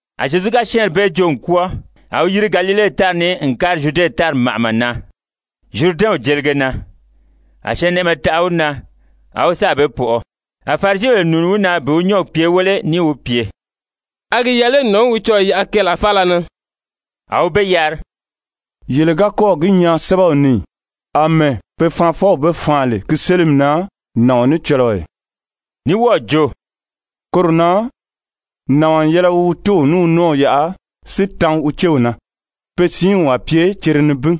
A Zyezu ga syɛ́ɛnri bee joo n kwɔ́ɔ, a wi yiri Galile tári ni n kári Zyude tári màʔama na, Zyuridɛnw jelige na. A syɛɛnnɛʔɛmɛ taʔa wi na, a wi sáà be pɔʔɔ. A Farisibèle nùuni wi na bi wi nyɔ́ɔgi pye wéle níì wi pye: «A gi yɛlɛ lé nàɔn í wi cɔɔ̀ yaʔa keelaa faala na?» A wi be yari: «Yele ga kɔ́ɔ̀ gi nyaa sɛ́bɛw ni ì, àmɛɛ pe Faanfɔw be faan lè ki sélimi na nàɔn ní cɔlɔɔ ì?» Ní wɔ́ɔ̀ jo: « ‹Koro na nàɔn n yɛlɛ wi wi tóow ní wi nɔ́ɔw yaʔa si tan wi céw na. Pe siinw a pye cere nibin.›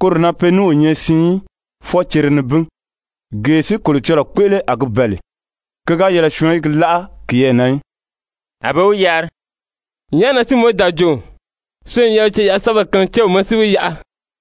Koro na pe ní o nyɛ siin í, fwɔɔ cere nibin. Gee si Kolocɔlɔɔ kpéʔele a gi bɛ̀ɛ lè, ki ga yɛlɛ syɔɔn í gi láʔa kiyɛɛ na í.» A be wi yari: «Nyàʔá na si Mowizi da jo, syɔɔn n yɛlɛ wi ceyaʔa-sɛ́bɛ kaan céw ma si wi yaʔa?»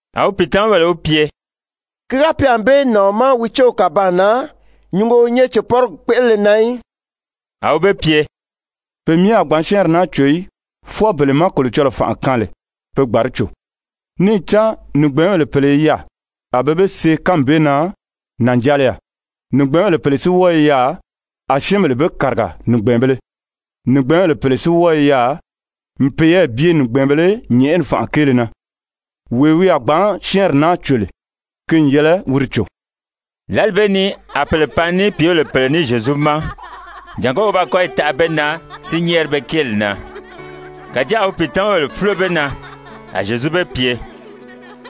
A wi pìitamabèle wi pye: «Ki ga pye ànbée nàɔn ma wi céw kàbaan na, nyùngo o nyɛ cèpɔrigi kpéʔelele na í.» A wi be pye: «Pe myɛ a gbǎn syɛ́ɛnri naa cò í, fwɔɔ bele má Kolocɔlɔɔ fànʔa kaan lè pe gbǎn di cò. Níì cán nìgbɛɛnbèle pèle i yaà, a be be see kánmi bee na, nànjaliya. Nìgbɛɛnbèle pèle si wɔ́ɔ i yaà, a syɛ́ɛnbèle be kàriga nìgbɛɛnbēle, nìgbɛɛnbèle pèle si ní wɔ́ɔ i yaà n peyɛɛ bye nìgbɛɛnbēle nyɛ̀ʔɛni fànʔa kéele na. Wee wi a gbǎn syɛ́ɛnri naa cò lè, ki n yɛlɛ wi di cò.» Lǎli bee ni a pèle pan ní pìíbèle pèle ní Zyezu ma, jàngó wi ba kɔ́yi taʔa be na si nyɛ́ɛri be kéeli na. Kàjáa a wi pìitamabèle fúlo be na. A Zyezu be pye: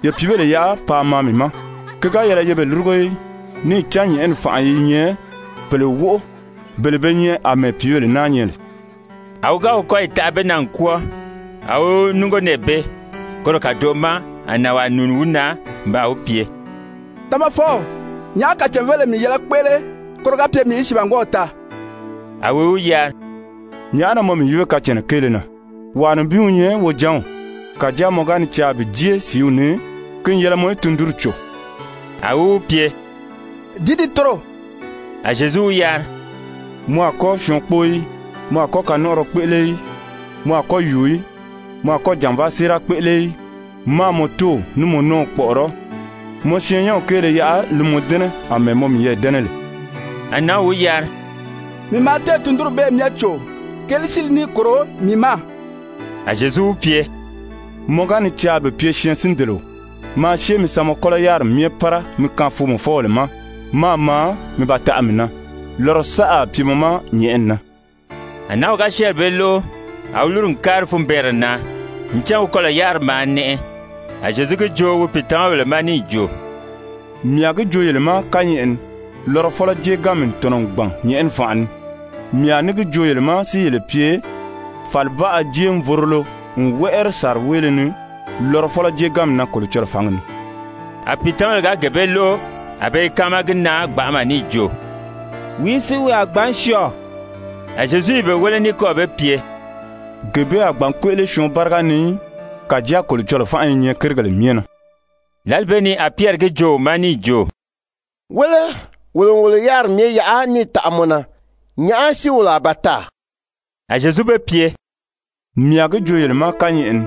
«Ye pìíbèle yaʔa paa maa mii ma, ki ga yɛlɛ ye be lúrugo í. Níì cán nyɛ̀ʔɛni fànʔa i nyɛ pèle wóʔo, bele be nyɛ àmɛɛ pìíbèle naa nyɛ lè.» A wi ga wi kɔ́yi taʔa be na n kwɔ́ɔ, a wi núngo nɛɛ bee. Koro kàdoʔo ma a nànwaa nùuni wi na n baa wi pye: «Tamafɔw, nyàʔá kacàn-vélile mii yɛlɛ mii í kpéʔele, koro ga pye mii í sìibangwɔɔw taa?» A wi wi yari: «Nyàʔá na mɔ mii yíbe kacànna kéele na? Wàa nibin wi nyɛ wojanw. Kàjáa mɔ ga ni caa bi jée sìíw ni, ki n yɛlɛ mɔ í tundunri cò.» A wi wi pye: «Dìí dii toro?» A Zyezu wi yari: «Mɔ a kɔ́ syɔɔn kpóo í. Mɔ a kɔ́ kanɔnʔɔrɔ kpéʔele í. Mɔ a kɔ́ yùu í. Mɔ a kɔ́ jànvaa séera kpéʔele í. Máā mɔ tóow ní mɔ nɔ́ɔw kpɔ̀ʔɔrɔ́. Mɔ syɛɛnnyɛnw kéele yaʔa li mɔ dɛ́nɛ àmɛɛ mɔ miyɛɛ dɛ́nɛ lè.» A nǎnw wi yari: «Mii maa téè tundunri bee myɛ cò. Keelìí si li níì kòro mii ma?» A Zyezu wi pye: «Mɔ ga ni caa bi pye syɛɛnsindeleo, maa syée mi sa mɔ kɔ́lɔ yáriri myɛ pára mi kaan foomɔfɔbèle ma, máā maa mi ba taʔa mii na, lɔrɔ saʔa a pye mɔ ma nyɛ̀ʔɛni na.» A nǎnw ga syɛ́ɛnri bee lóʔo, a wi lúru n kári funbɛɛnrɛ na, ncan wi kɔlɔ̀ yáriri maa nɛʔɛ. A Zyezu gi joo wi pìitamabèle ma níì jo: «Mii a gi joo yele ma kányɛʔɛ ni lɔrɔfɔlɔ jéeganmi n tɔ̀nɔ n gbàn nyɛ̀ʔɛni fànʔa ni. Mii a ní gi joo yele ma si yele pye, fàlibaʔa jéevorolo n wɛ́ʔɛri sàriweele ni lɔrɔfɔlɔ jéeganmi na Kolocɔlɔɔ fǎngi ni.» A pìitamabèle ga gee bee lóʔo a be i káama gi na gbanʔama níì jo: «Wìí si wi a gbǎn syɔɔ?» A Zyezu i be wéle ní kɔ́ɔ̀ be pye: «Gee bee a gbǎn kpéʔele syɔɔn báriga ni í, kàjáa Kolocɔlɔɔ fánʔa i nyɛ kérigèle myɛ na.» Lǎli bee ni a Pyɛri gi joo wi ma níì jo: «Wéle, wolo n wolo yáriri myɛ yaʔa níì taʔa mɔ na, nyàʔá si wolo a ba taa?» A Zyezu be pye: «Mii a gi joo yele ma kányɛʔɛ ni,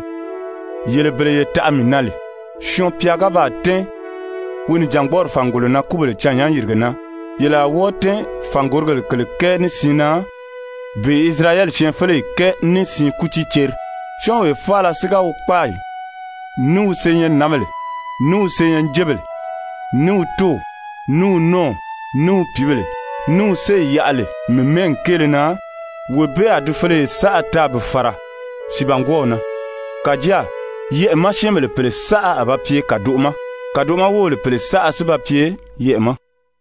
yele bele ye taʔa mii na lè, Syɔɔn-pya ga baa tɛ́ɛn wi nìjangbɔɔri fàngolo na kúbèle cânnyán-yìrige na, yele a wɔ́ɔ tɛ́ɛn fàngorigèle kèle kɛɛ ní siin na bi Isirayɛli syɛɛnfeleyi kɛɛ ní siin kútii ceri. Syɔ́ɔnwee faala si ga wi kpáayi, ní wi senyɛnnǎnbèle, ní wi senyɛnjebèle, ní wi tóow, ní wi nɔ́ɔw, ní wi pìíbèle, ní wi séyi yaʔa lè mii mɛ́ɛgi kéele na, wee bee a di feleye saʔa taa bi fàra sìibangwɔɔw na. Kàjáa yɛʔɛ̀ ma syɛ́ɛnbèle pèle saʔa a ba pye kàdoʔo ma, kàdoʔo ma wóbèle pèle saʔa si ba pye yɛʔɛ̀ ma.